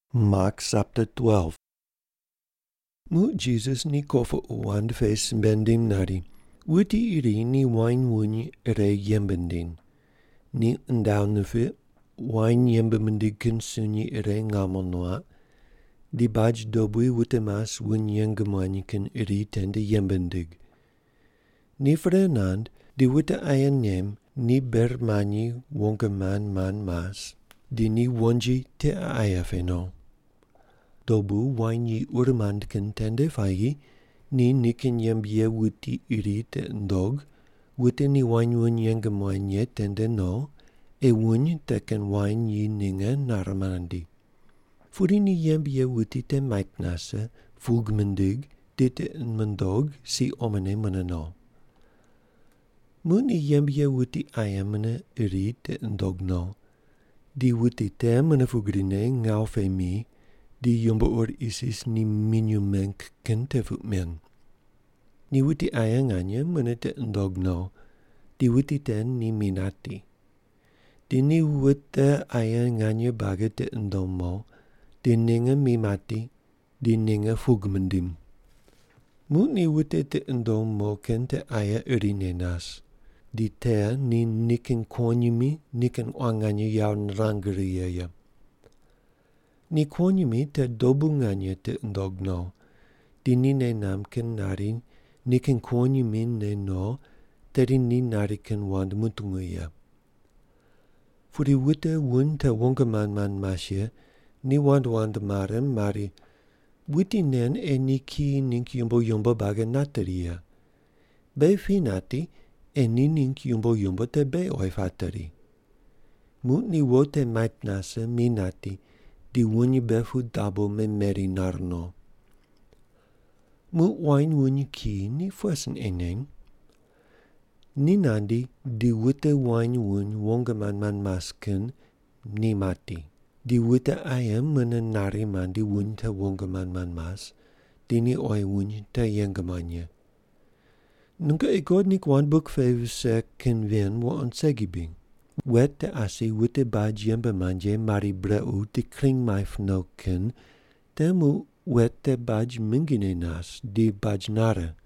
Muq Jisas ni kopuqu wand pe simbe nindim nari, “Wuti iri ni wain wuny ire yembe nindiny. Ni undaw nipiq, wain yembe mindig kin sunyi ire ngamo nuaq, di baj dobui wute mas wuny yeng muany kin iri tende yembe nindig. Ni pre nand di wute aye nem ni ber manyine wong mand mand mas, di ni wonji tiqe aye pe no. Dobu wain yi uri mand kin tende puayi ni nikin yembe ye wuti iri tiqi nundog wute ni wain wuny yeng muany ye tende no ei wuny te kin wain yi ninge nare nandi. Pudi ni yembe ye wuti te mait nase, pug mindig di tiqi mundog si omone mune no. Muq ni yembe ye wuti aye mune iri tiqi nundog no, di wuti te mune pugrine ngawu pe mi di yumbo ur isis ni minyuw meng kin te puq men. Ni wuti aye nganye mune tiqi nundog no, di wuti te ni mi nati. Di ni wute aye nganye buagi tiqi nundom mo, di ninge mi mati di ninge pug mindim. “Muq ni wute tiqi nundom mo kin te aye irine nas. Di te ni nikin kuwonyimi nikin quan nganye yawo nirang righe ye. Ni kuwonyimi te dobu nganye tiqi nundog no, di ni nei namb kin nari nikin kuwonyimi ne no tedi ni nari kin wand mutungu ye. “Pudi wute wuny te wong mand mand mas ye ni wand wand mare mari, ‘Wuti nen ei ni kiyi ningg yumbo yumbo buagi nateri ye. Beghi pi nati, ei ni ningg yumbo yumbo te beghi oyi pateri.’ Muq ni wo te mait nase mi nati di wuny mbe pu dabo memeri nar no. “Muq wain wuny kiyi ni pughe sin ei nen? Ni nandi di wute wain wuny wong mand mand mas kin ni mati, di wute aye mune nari mandi wuny te wong mand mand mas, di ni oyi wuny te yeng muany ye. Nungoqi God ningg wand buk pe vise kin ven wuqond segi bri? ‘Wet te asi wute baj yembe mand ye mari brequ di kring maip no kin te muq wet te baj mingine nas di baj nare.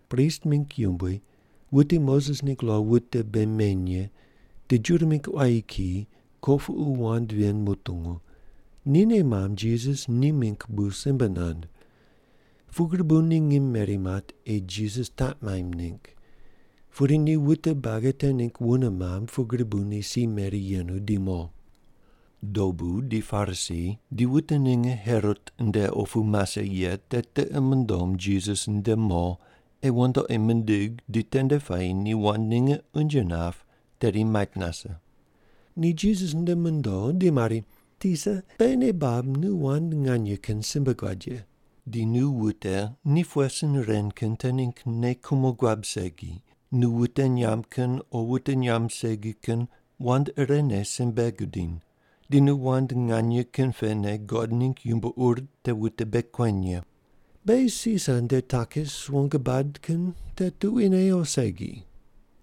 Prist mingg yumbui, wute Moses ningg lo wute bei meny ye di Juda mingg quayi kiyi kopuqu wand ven mutungu, ni nei mamb Jisas ni mingg bu simbe nand. Pugri bu ni ngim meri mat ei Jisas taq maimb ningg, pudi ni wute buagi te ningg wune mamb, pugri bu ni si meri yenu di mo. Dobu ni Parisi di wute ninge Herot nde opu mase ye te tiqi mundom Jisas nde mo ei wandoqi mindig di tende puayi ni wand ninge unje nap tedi mait nase. Ni Jisas nde mondo di mari, “Tisa, beghi nei bab nu wand nganye kin simbe guad ye. Di nu wute ni pughe sin ren kin te ningg nei kumo guab segi, nu wute nyamb kin o wute nyamb segi kin wand irene simbe gudiny, di nu wand nganye kin pene God ningg yumbo ur te wute bei kueny ye. Beghi Sisar nde takis wong bad kin te tuquine o segi?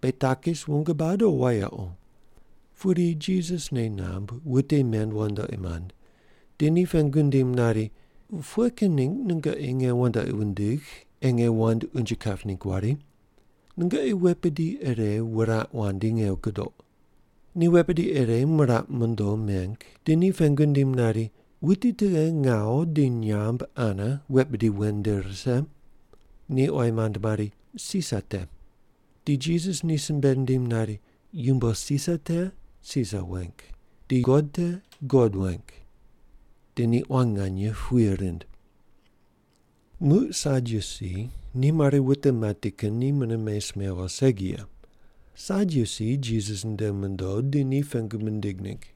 Beghi takis wong bad o wayequ?” Pudi Jisas nei namb wute men wandoqi mand, di ni pengu nindim nari, “Pughe kin ningg nungoqi nge wandoqi wundigh ei nge wand unje kap ningg wari? Nungoqi wet bidi ire wuraq wandi nge gudoq.” Ni wet bidi ire miraq mondo meng di ni pengu nindim nari, “Wuti tughe ngawu di nyamb ane wet bidi wen nde rise?” Ni oyi mand mari, “Sisar te.” Di Jisas ni simbe nindim nari, “Yumbo Sisar te, Sisar weng; di God te, God weng.” Di ni quan nganye puye rind. Muq Sadyusi ni mari wute mati kin ni mune mes mewo segi ye. Sadyusi Jisas nde mondo di ni pengu mindig ningg.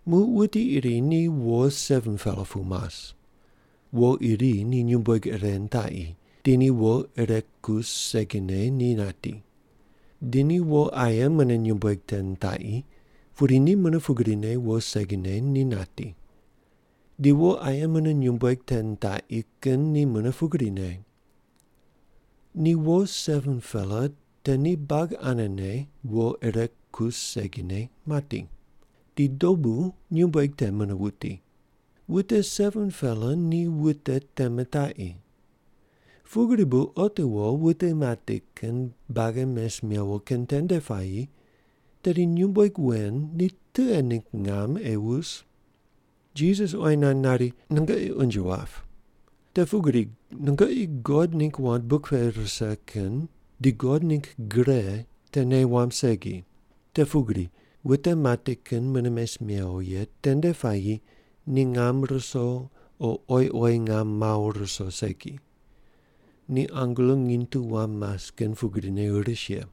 Muq wuti iri ni wo 7-pela pu mas. Wo iri ni nyumbueg ire nitaqi di ni wo ire kus segine ni nati. Di ni wo aye mune nyumbueg te nitaqi, pudi ni mune pugrine wo segine ni nati. Di wo aye mune nyumbueg te nitaqi kin ni mune pugrine. Ni wo 7-pela te ni buagi anene wo ire kus segine mati. Di dobu nyumbueg te mune wuti. Wute 7-pela ni wute te mitaqi. Pugri bu otiwo wute mati kin buagi mes mewo kin tende puayi tedi nyumbueg wen ni tughe ningg ngam ei wus?” Jisas oyi nand nari, “Nungoqi unje wap. Te pugri nungoqi God ningg wand buk pe rise kin di God ningg gre te nei wamb segi. Te pugri wute mati kin mune mes mewo ye tende puayi ni ngam ruso o oyi oyi ngam mawo ruso segi. Ni angelo nginy tu wam mas kin pugrine ris ye.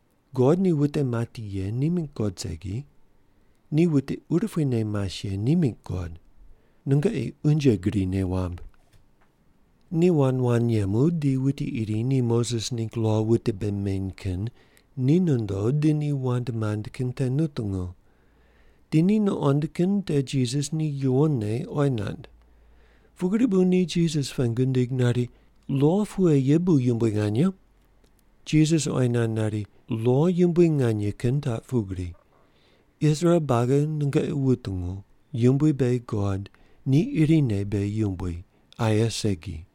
God ni wute mati ye ni mingg God segi, ni wute urupuine mas ye ni mingg God. Nungoqi unje gri nei wamb.” Ni wand wand yemu di wuti iri ni Moses ningg lo wute bei neny kin ni nondo di ni wand mand kin te nutungu. Di ni nuqond kin te Jisas ni yuwonne oyi nand. Pugri bu ni Jisas pengu nindig nari, “Lo pughe ye bu yumbui nganye?” Jisas oyi nand nari, “Lo yumbui nganye kin taq pugri: ‘Israel buagi nungoqi wutungu Yumbui beghi God, ni irine beghi Yumbui, aye segi.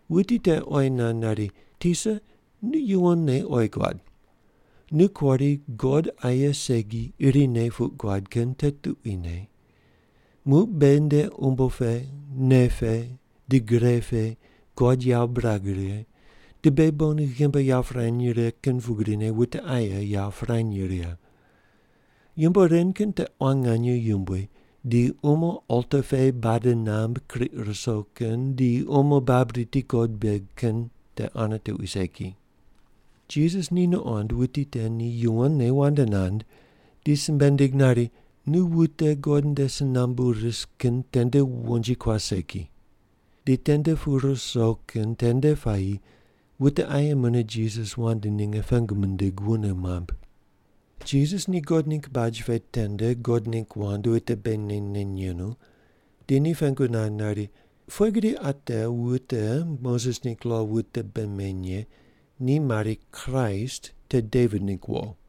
Wuti te oyi nand nari, “Tisa, nu yuwonne oyi guad. Nu kuari God aye segi irine puq guad kin te tuquine. Muq beghi nde umbo pe, nei pe, di gre pe God yawo birag righe, di beghi bon ghimbi yawo pirany righe kin pugrine wute aye yawo pirany righe. Yumbo ren kin te quan nganye yumbui di umo alta pe bade namb kriq ruso kin di umo bab riti God beg kin te ane tuqui segi.” Jisas ni nuqond wuti te ni yuwonne wand nand, di simbe nindig nari, “Nu wute God nde si nambu ris kin tende wonji kuas segi.” Di tende pu ruso kin tende puayi wute aye mune Jisas wand ninge pengu mindig wune mamb. Jisas ni God ningg baj pe tende God ningg wand wute bei neny neny yenu di ni pengu nand nari, “Pughe gri ate wute Moses ningg lo wute bei meny ye ni mari Kraist te Devit ningg wo?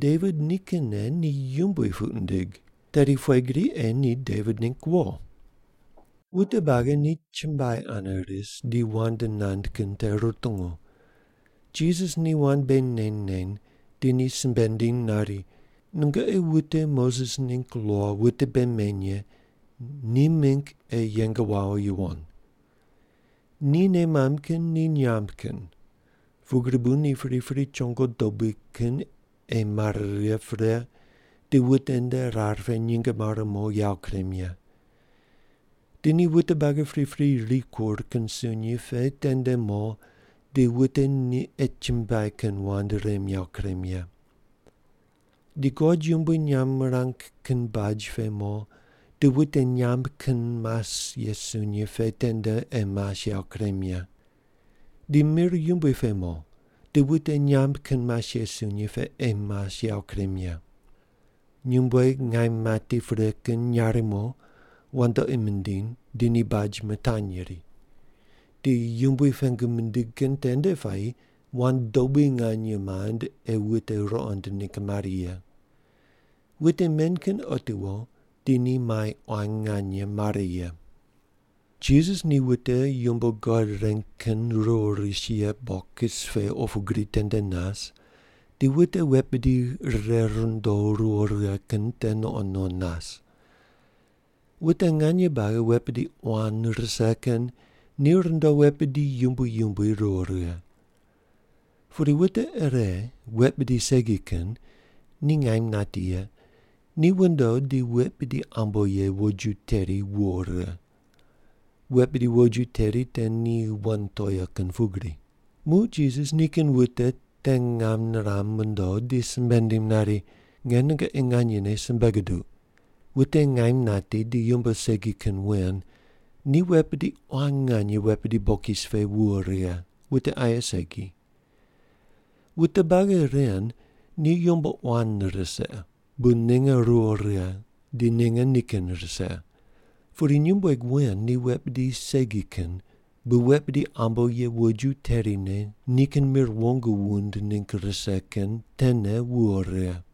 Devit nikinne ni Yumbui puq nindig, tedi pughe gri ei ni Devit ningg wo?” Wute buagi ni chumbuai ane ris ni wand nand kin te rutungu. Jisas ni wand bei neny neny di ni simbe nindiny nari, “Nungoqi wute Moses ningg lo wute bei meny ye ni mingg ei yeng wawo yuwon. Ni nei mamb kin ni nyamb kin, pugri bu ni pripri chongo dobui kin ei mare righe pre di wute nde rar pe nyinge mare mo yawo kurem ye. Di ni wute buagi pripri rikur kin sunyi pe tende mo di wute ni ei chumbuai kin wand rem yawo kurem ye. Di God yumbui nyamb mirang kin baj pe mo di wute nyamb kin mas ye sunyi pe tende ei mas yawo kurem ye. Di mir yumbui pe mo di wute nyamb kin mas ye sunyi pe ei mas yawo kurem ye. Nyumbueg ngaim mati pre kin nyarimo wandoqi mindiny di ni baj mitanyri. Di Yumbui pengu mindig kin tende puayi wand dobui nganye mand ei wute ruqond ningg mari ye. Wute men kin otiwo di ni mai quan nganye mare ye.” Jisas ni wute yumbo God reng kin ruwo ris ye bokis pe opu gri tende nas di wute wet bidi rire rundo ruwo righe kin te nuqond nuqond nas. Wute nganye buagi wet bidi quan rise kin ni rundo wet bidi yumbui yumbui ruwo righe. Pudi wute ire wet bidi segi kin ni ngaim nati ye ni wundo di wet bidi ambo ye woju teri wuwo righe. Wet bidi woju teri te ni wan toea kin pugri. Muq Jisas nikin wute te ngam niram mondo di simbe nindim nari, “Nge nungoqi nganyene simbe guduq, wute ngaim nati di yumbo segi kin wen ni wet bidi quan nganye wet bidi bokis pe wuwo righe, wute aye segi. Wute buagi ren ni yumbo quan rise bu ninge ruwo righe di ninge nikin rise. Pudi nyumbueg wen ni wet bidi segi kin bu wet bidi ambo ye woju terine nikin mir wong wund ningg rise kin tene wuwo righe.”